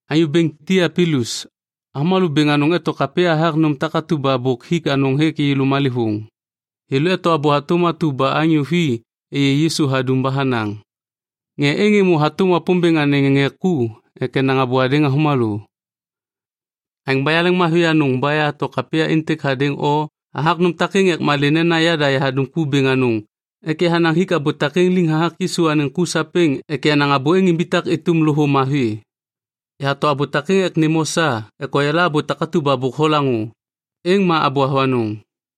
Anyô bêŋ Tiapilus, avômalô bêŋ anôŋ eto kapya hathak nôm takatu ba bôk hik anôŋ hêk yêlô malêvôŋ. Thêlô eto abô hatôm atu ba anyô vi êyê Yisu hadum ba hanaŋ. Ŋê êŋ êmô hatôm Wapômbêŋ anêŋ ŋê ku ek enaŋ abô hadêŋ avômalô. Aêŋ ba yaleŋmavi anôŋ ba yahato kapya êntêk hadêŋ o hathak nôm takêŋ ek malê nena yada yahadum ku bêŋ anôŋ ek yahanaŋ hik abô takêŋ liŋ hathak Yisu anêŋ ku sapêŋ ek yenaŋ abô êŋ imbitak êtôm loho mavi. Yahato abô takêŋ ek nêm o sa ek oyala abô takatu ba bôk holaŋô, êŋ ma abô avanôŋ.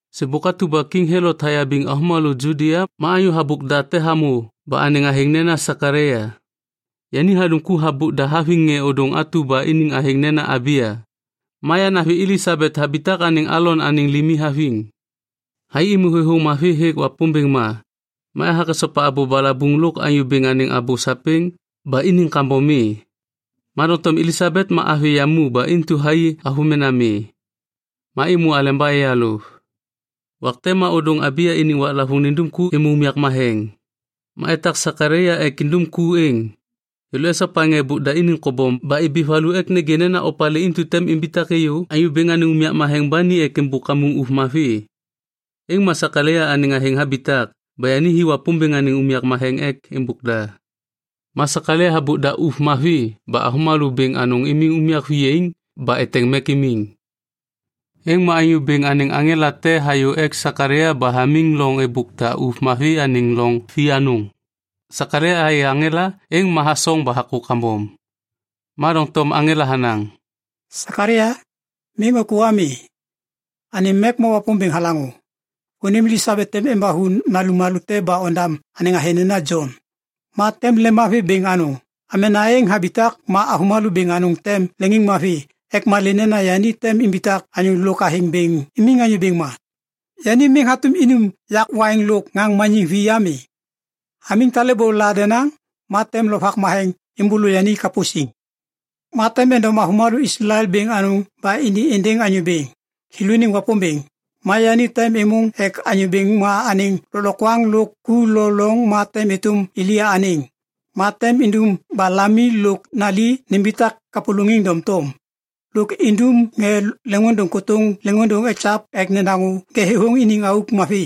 Sêbôk atu ba Kiŋ Helot hayabiŋ avômalô Judia ma anyô habôk da te hamô ba anêŋ athêŋ nena Sekalaia. Yani hadum ku habôk da haviŋ ŋê ôdôŋ atu ba iniŋ athêŋ nena Abiya. Ma yanavi Elisabet habitak anêŋ Alon anêŋ limi haviŋ. Thai êmô thêthôŋ mavi hêk Wapômbêŋ ma, ma ethak esopa abô balabuŋ lôk Anyô Bêŋ anêŋ abô sapêŋ ba iniŋ kambom mi. Ma doŋtom Elisabet ma avi yamu ba intu thai avômena mi, ma êmô aleba eyalôv. Wak te ma ôdôŋ Abiya iniŋ waklavôŋ nindum ku êmô unyak matheŋ. Ma etak Sekalaia ek indum ku êŋ. Thêlô esopa ŋê êbôk da iniŋ kobom ba ibi valu ek nêgê nena opalê intu tem imbitak êyô Anyô Bêŋ anêŋ unyak matheŋ ba ni ek êmbôk kamuŋ ôv mavi. Êŋ ma Sekalaia anêŋ athêŋ habitak ba yani hi Wapômbêŋ anêŋ unyak ek êmbôk da. Ma Sekalaia habôk da ôv mavi ba avômalô bêŋ anôŋ imiŋ unyak viyaiŋ ba eteŋ mek imiŋ. Êŋ ma Anyô Bêŋ anêŋ aŋela te hayô ek Sekalaia ba hamiŋ loŋ êbôk da ôv mavi anêŋ loŋ vianôŋ. Sekalaia hayê aŋela, êŋ ma hasoŋ ba hakô kambom. Ma doŋtom aŋela hanaŋ, “Sekalaia, miŋ ôkô ami. Anêm mek ma Wapômbêŋ halaŋô. Vônim Elisabet tem embathu nalum malô te ba ondam anêŋ athêŋ nena Jon. Ma tem lemmavi bêŋ anôŋ. Amena êŋ habitak ma avômalô bêŋ anôŋ tem leŋiŋmavi ek malê nena yani tem imbitak anyô lôk athêŋ bêŋ imiŋ Anyô Bêŋ ma. Yani miŋ hatôm inum yak waiŋ lôk ŋaŋ maniŋ vi ami. Hamiŋ talêbô la denaŋ ma tem Lovak Matheŋ êmbôlô yani kapô siŋ. Ma tem endom avômalô Islael bêŋ anôŋ ba ini êndêŋ Anyô Bêŋ, thêlôniŋ Wapômbêŋ. Ma yani tem êmôŋ ek Anyô Bêŋ ma anêŋ lôklokwaŋ lôk ku lo loŋ ma tem êtôm Elia anêŋ. Ma tem indum ba lami lôk nali nimbitak kapôlôŋiŋ doŋtom. Lôk indum ŋê leŋôndôŋ kôtôŋ leŋôndôŋ ekyav ek nedaŋô ŋê thêthôŋ iniŋ auk mavi.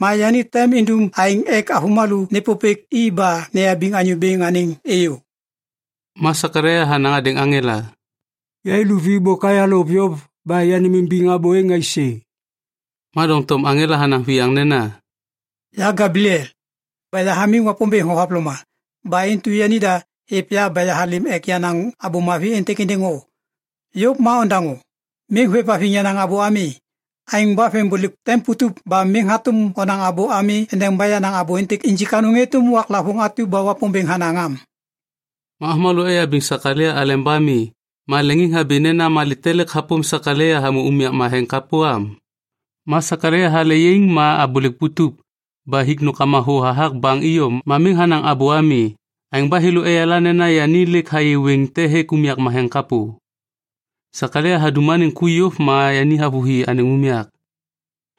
Ma yani tem indum aêŋ ek avômalô nêpôpêk i ba neyabiŋ Anyô Bêŋ anêŋ êyô.” Ma Sekalaia hanaŋ hadêŋ aŋela, “Yai luvi bôk ayalôv yôv ba yanêmimbiŋ abô êŋ aisê?” Ma doŋtom aŋela hanaŋ viyaŋ nena, “Ya Gebliel, ba yahamiŋ Wapômbêŋ thohavloma. Ba intu yanida hêv ya ba yahalêm ek yanaŋ abô mavi êntêk êndêŋ o. Yôv ma ondaŋô, miŋ hôêvhaviŋ yenaŋ abô ami. Aêŋ ba vembôlêk tem putup ba miŋ hatôm onaŋ abô ami endeba yenaŋ abô êntêk injik anôŋ êtôm waklavôŋ atu ba Wapômbêŋ hanaŋ am.” Avômalô eyabiŋ Sekalaia aleba mi ma leŋiŋhabi nena malê te lêk hapôm Sekalaia hamô unyak matheŋ kapô am? Ma Sekalaia hale yaiŋ ma abôlêk putup. Ba hik nômkama thô hathak baŋ iyom ma miŋ hanaŋ abô ami. Aêŋ ba thêlô eyala nena yani lêk hayê wêŋ te hêk unyak matheŋ kapô. Sekalaia hadum anêŋ ku yôv ma yani havôhi anêŋ unyak.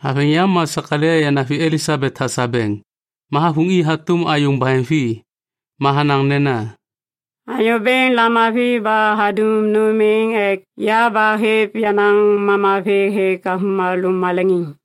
Haveŋ yam ma Sekalaia yanavi Elisabet hasabeŋ. Ma havuŋ i hatôm ayôŋ baheŋvi. Ma hanaŋ nena, “Anyô Bêŋ lamavi ba hadum nôm êŋ ek ya ba hêv yenaŋ mama vê hêk avômalô maleŋiŋ.”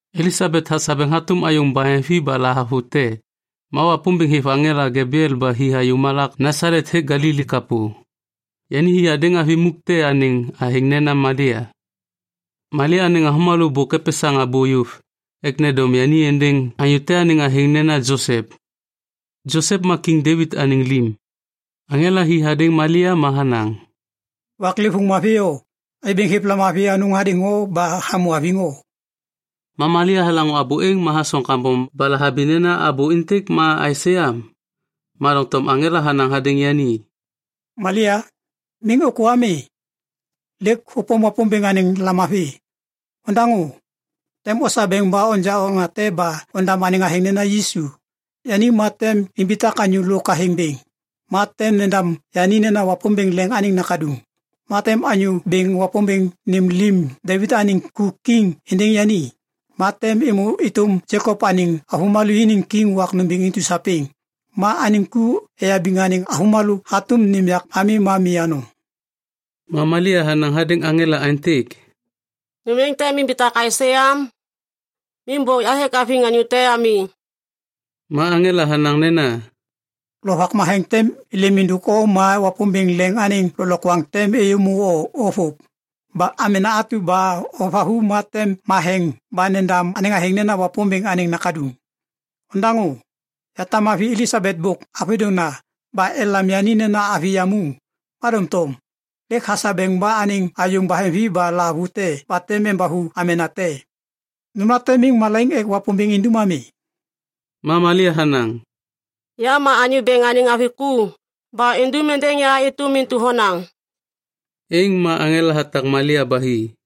Elisabet hasabeŋ hatôm ayôŋ baheŋvi ba lahavute, ma Wapômbêŋ hêv aŋela Gebliel ba hi hayô malak Nasalet hêk Galili kapô. Yani hi hadêŋ avi muk te anêŋ athêŋ nena Malia. Malia anêŋ avômalô bôk epesaŋ abô yôv ek nendom yani êndêŋ anyô te anêŋ athêŋ nena Josep. Josep ma Kiŋ Devit anêŋ lim. Aŋela hi hadêŋ Malia ma hanaŋ, “Waklêvôŋ mavi o! Anyô Bêŋ hêv lamavi anôŋ hadêŋ o ba hamô haviŋ o.” Ma Malia halaŋô abô êŋ ma hasoŋ kambom ba lahabi nena abô êntêk ma aisê am. Ma doŋtom aŋela hanaŋ hadêŋ yani, “Malia, miŋ ôkô ami. Lêk hôpôm Wapômbêŋ anêŋ lamavi. Ondaŋô, tem osabeŋ ba onja okna te ba ondam anêŋ athêŋ nena Yisu. Yani ma tem imbitak anyô lôk athêŋ bêŋ. Ma tem nendam yani nena Wapômbêŋ Leŋ anêŋ Nakaduŋ. Ma tem Anyô Bêŋ Wapômbêŋ nêm lim Devit anêŋ ku kiŋ êndêŋ yani. Ma tem êmô êtôm Jekop anêŋ avômalô iniŋ kiŋ wak nômbêŋ intu sapêŋ. Ma anêŋ ku eyabiŋ anêŋ avômalô hatôm nêm yak ami ma mi anôŋ.” Ma Malia hanaŋ hadêŋ aŋela aêntêk, “Nôm êŋ tem imbitak aisê am? Miŋ bôk yahêk haviŋ anyô te ami.” Ma aŋela hanaŋ nena, “Lovak Matheŋ tem êlêm êndôk o ma Wapômbêŋ Leŋ anêŋ lôklokwaŋ tem êyô o vôv. Ba amena atu ba hovathu ma tem matheŋ ba nendam nena Wapômbêŋ Anêŋ Nakaduŋ. Ondaŋô. Yatam avi Elisabet bôk avôdôŋna ba elam yani nena avi yamu, ma doŋtom lêk hasabeŋ ba anêŋ ayôŋ baheŋvi ba lahavute ba tem embathu amena te. Nômlate miŋ malaiŋ ek Wapômbêŋ indum ami.” Ma Malia hanaŋ, “Ya ma Anyô Bêŋ anêŋ avi ku. Ba indum êndêŋ ya êtôm intu honaŋ.” Êŋ ma aŋela hatak Malia ba hi.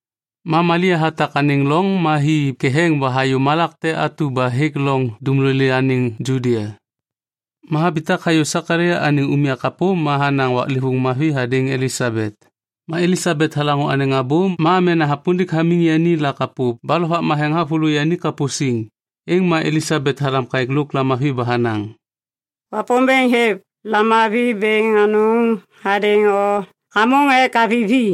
Ma Malia hatak anêŋ loŋ ma hi ketheŋ ba hayô malak te atu ba hêk loŋ dumlolê anêŋ Judia. Ma habitak hayô Sekalaia anêŋ unyak kapô ma hanaŋ waklêvôŋ mavi hadêŋ Elisabet. Ma Elisabet halaŋô anêŋ abô ma amena hapundik hamiŋ yani la kapô ba Lovak Matheŋ havôlô yani kapô siŋ. Êŋ ma Elisabet halam kaêk lôk lamavi ba hanaŋ, “Wapômbêŋ hêv lamavi bêŋ anôŋ hadêŋ o hamôŋ ek avi vi.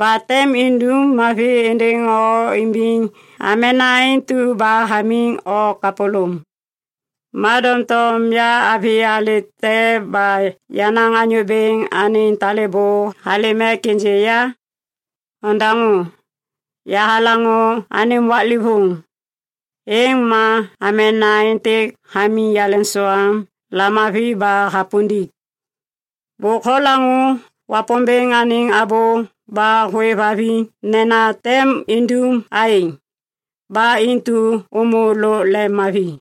Ba tem indum mavi êndêŋ o imbiŋ amena intu ba hamiŋ o kapôlôm. Ma doŋtom ya avi alê te ba yenaŋ Anyô Bêŋ anêŋ talêbô halêm ek ênjê ya? Ondaŋô, yahalaŋô anêm waklêvôŋ, êŋ ma amena êntêk hamiŋ yaleŋsoam lamavi ba hapundik. Bôk holaŋô Wapômbêŋ anêŋ abô ba hôêvhaviŋ nena tem indum aêŋ. Ba intu ômô lôk lemmavi!”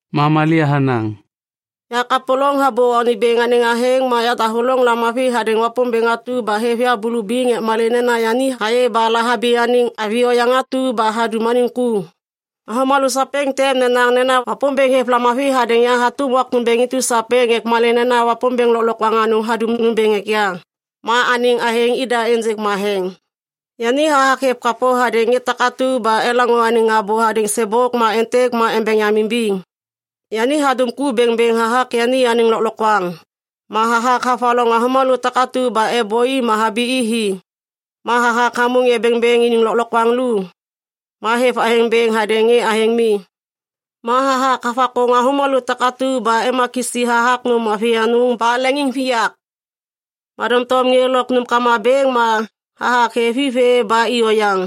Ma Malia hanaŋ, “Yakapôlôŋ habô Anyô Bêŋ anêŋ athêŋ, ma yadahôlôŋ lamavi hadêŋ Wapômbêŋ atu ba hêv ya bulubiŋ ek malê nena yani hayê ba lahabi anêŋ avi oyaŋ atu ba hadum anêŋ ku. Avômalô sapêŋ tem nenaŋ nena Wapômbêŋ hêv lamavi hadêŋ ya hatôm wak nômbêŋ intu sapêŋ ek malê nena Wapômbêŋ Lôklokwaŋ Anôŋ hadum nômbêŋ ek ya. Ma anêŋ athêŋ ida ênjêk matheŋ. Yani hathak hêv kapô hadêŋ ŋê takatu ba elaŋô anêŋ abô hadêŋ sêbôk ma êntêk ma embeŋ yam imbiŋ. Yani hadum ku bêŋbêŋ hathak yani anêŋ lôklokwaŋ. Ma hathak havaloŋ avômalô takatu ba êbôi ma habi i hi. Ma hathak hamô ŋê bêŋbêŋ iniŋ lôklokwaŋ lu. Ma hêv athêŋ bêŋ hadêŋ ŋê athêŋ mi. Ma hathak havakôŋ avômalô takatu ba ema kisi hathak nôm mavi anôŋ ba leŋiŋviyak. Ma doŋtom ŋê lôk nômkama bêŋ, ma hathak hêv i vê ba i oyaŋ.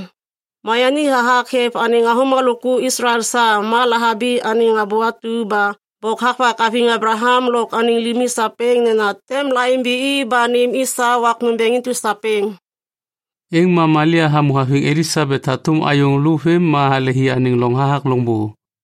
Ma yani hathak hêv anêŋ avômalô ku Islael sa, ma lahabi anêŋ abô atu ba bôk havak haviŋ Ablaham lôk anêŋ limi sapêŋ nena tem laimbi i ba nêm i sa wak nômbêŋ intu sapêŋ.” Êŋ ma Malia hamô haviŋ Elisabet hatôm ayôŋ lô vêm ma halehi anêŋ loŋ hathak loŋbô.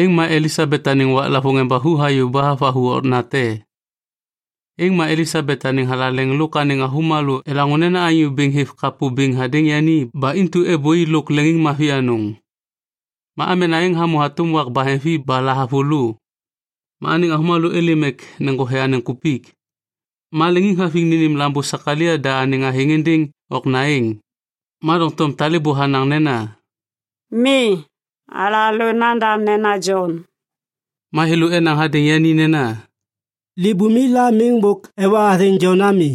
Ma Elisabet anêŋ waklavôŋ embathu hayô ba havathu okna te. Êŋ ma Elisabet anêŋ thalaleŋ lôk anêŋ avômalô elaŋô nena Anyô Bêŋ hêv kapô bêŋ hadêŋ yani ba intu êbôi lôk leŋiŋmavi anôŋ. Ma amena êŋ hamô hatôm wak baheŋvi ba lahavulô, ma anêŋ avômalô êlêm ek neŋgothe anêŋ kupik. Ma leŋiŋhaviŋ nênêm lambô Sekalaia da anêŋ athêŋ êndêŋ okna êŋ. Ma doŋtom talêbô hanaŋ nena, “Mi. Alalô nandam nena Jon.” Ma thêlô enaŋ hadêŋ yani nena, “Libumi la miŋ bôk ewa athêŋ Jon ami.”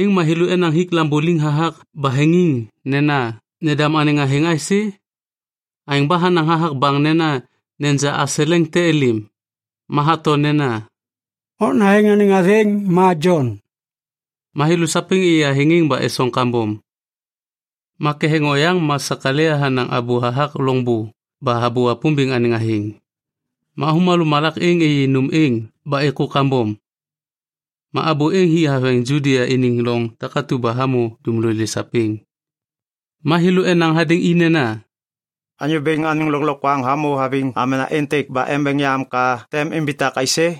Êŋ ma thêlô enaŋ hik lambô liŋ hathak baheŋiŋ nena nendam anêŋ athêŋ aisê? Aêŋ ba hanaŋ hathak baŋ nena neja aseleŋ te êlêm. Ma hato nena, “Okna êŋ anêŋ athêŋ ma Jon.” Ma thêlô sapêŋ êyê athêŋ êŋ ba esoŋ kambom. Ma ketheŋ oyaŋ ma Sekalaia hanaŋ abô hathak loŋbô ba habô Wapômbêŋ anêŋ athêŋ. Ma avômalô malak êŋ êyê nôm êŋ ba êkô kambom. Ma abô êŋ hi haveŋ Judia iniŋ loŋ takatu ba hamô dumlolê sapêŋ. Ma thêlô enaŋ hadêŋ i nena, “Anyô Bêŋ anêŋ lôklokwaŋ hamô haviŋ amena êntêk ba embeŋ yam ka tem imbitak aisê?”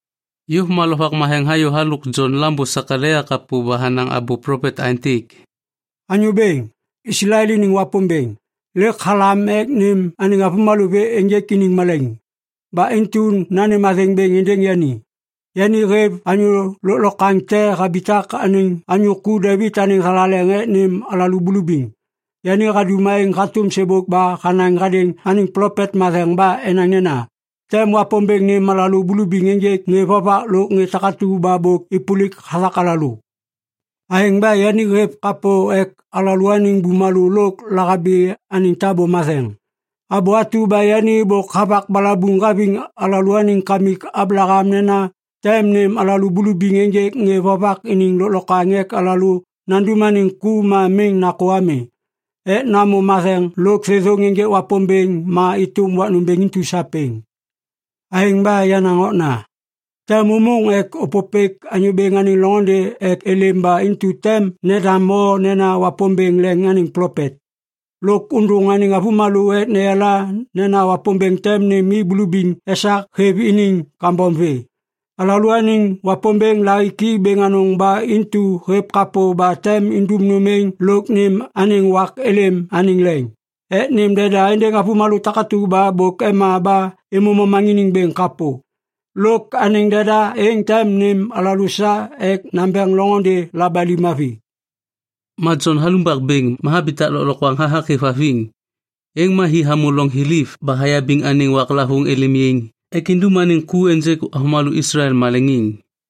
Yôv ma Lovak Matheŋ hayô halôk Jon lambô Sekalaia kapô ba hanaŋ abô plopet aêntêk, “Anyô Bêŋ, Islael iniŋ Wapômbêŋ, lêk halêm ek nêm anêŋ avômalô vê ênjêk iniŋ malaiŋ. Ba intu nanêm athêŋ bêŋ êndêŋ yani. Yani hêv Anyô Lôklokwaŋ te habitak anêŋ anyô ku Devit anêŋ thalaleŋ ek nêm alalô bulubiŋ. Yani hadum aêŋ hatôm sêbôk ba hanaŋ hadêŋ anêŋ plopet matheŋ ba enaŋ nena tem Wapômbêŋ nêm alalô bulubiŋ ênjêk ŋê vovak lôk ŋê takatu ba bôk êpôlik hathak alalô. Aêŋ ba yani hêv kapô ek alalôaniŋ bumalô lôk lahabi anêŋ tabô matheŋ. Abô atu ba yani bôk havak balabuŋ haviŋ alalôaniŋ kamik Ablaham nena tem nêm alalô bulubiŋ ênjêk ŋê vovak iniŋ lôklokwaŋ ek alalô nandum anêŋ ku ma miŋ nakô ami ek namô matheŋ lôk thêthôŋ ênjêk Wapômbêŋ ma êtôm wak nômbêŋ intu sapêŋ. Aêŋ ba, yenaŋ okna, tem ômôŋ ek ôpôpêk Anyô Bêŋ anêŋ loŋôndê ek êlêm ba intu tem nendam o nena Wapômbêŋ Leŋ anêŋ plopet. Lôk ôndôŋ anêŋ avômalô ek neyala nena Wapômbêŋ tem nêm i bulubiŋ esak hêv iniŋ kambom vê. Alalôaniŋ Wapômbêŋ lahiki bêŋ anôŋ ba intu hêv kapô ba tem indum nôm êŋ lôk nêm anêŋ wak êlêm anêŋ leŋ ek nêm deda êndêŋ avômalô takatu ba bôk ema ba êmô momaŋiniŋ bêŋ kapô. Lôk anêŋ deda êŋ tem nêm alalô sa ek nambeŋ loŋôndê labali mavi.” Ma Jon halumbak bêŋ ma habitak lôklokwaŋ hathak hêvhaviŋ. Êŋ ma hi hamô loŋ thiliv ba hayabiŋ anêŋ waklavôŋ êlêm yaiŋ ek indum anêŋ ku ênjêk avômalô Islael maleŋiŋ.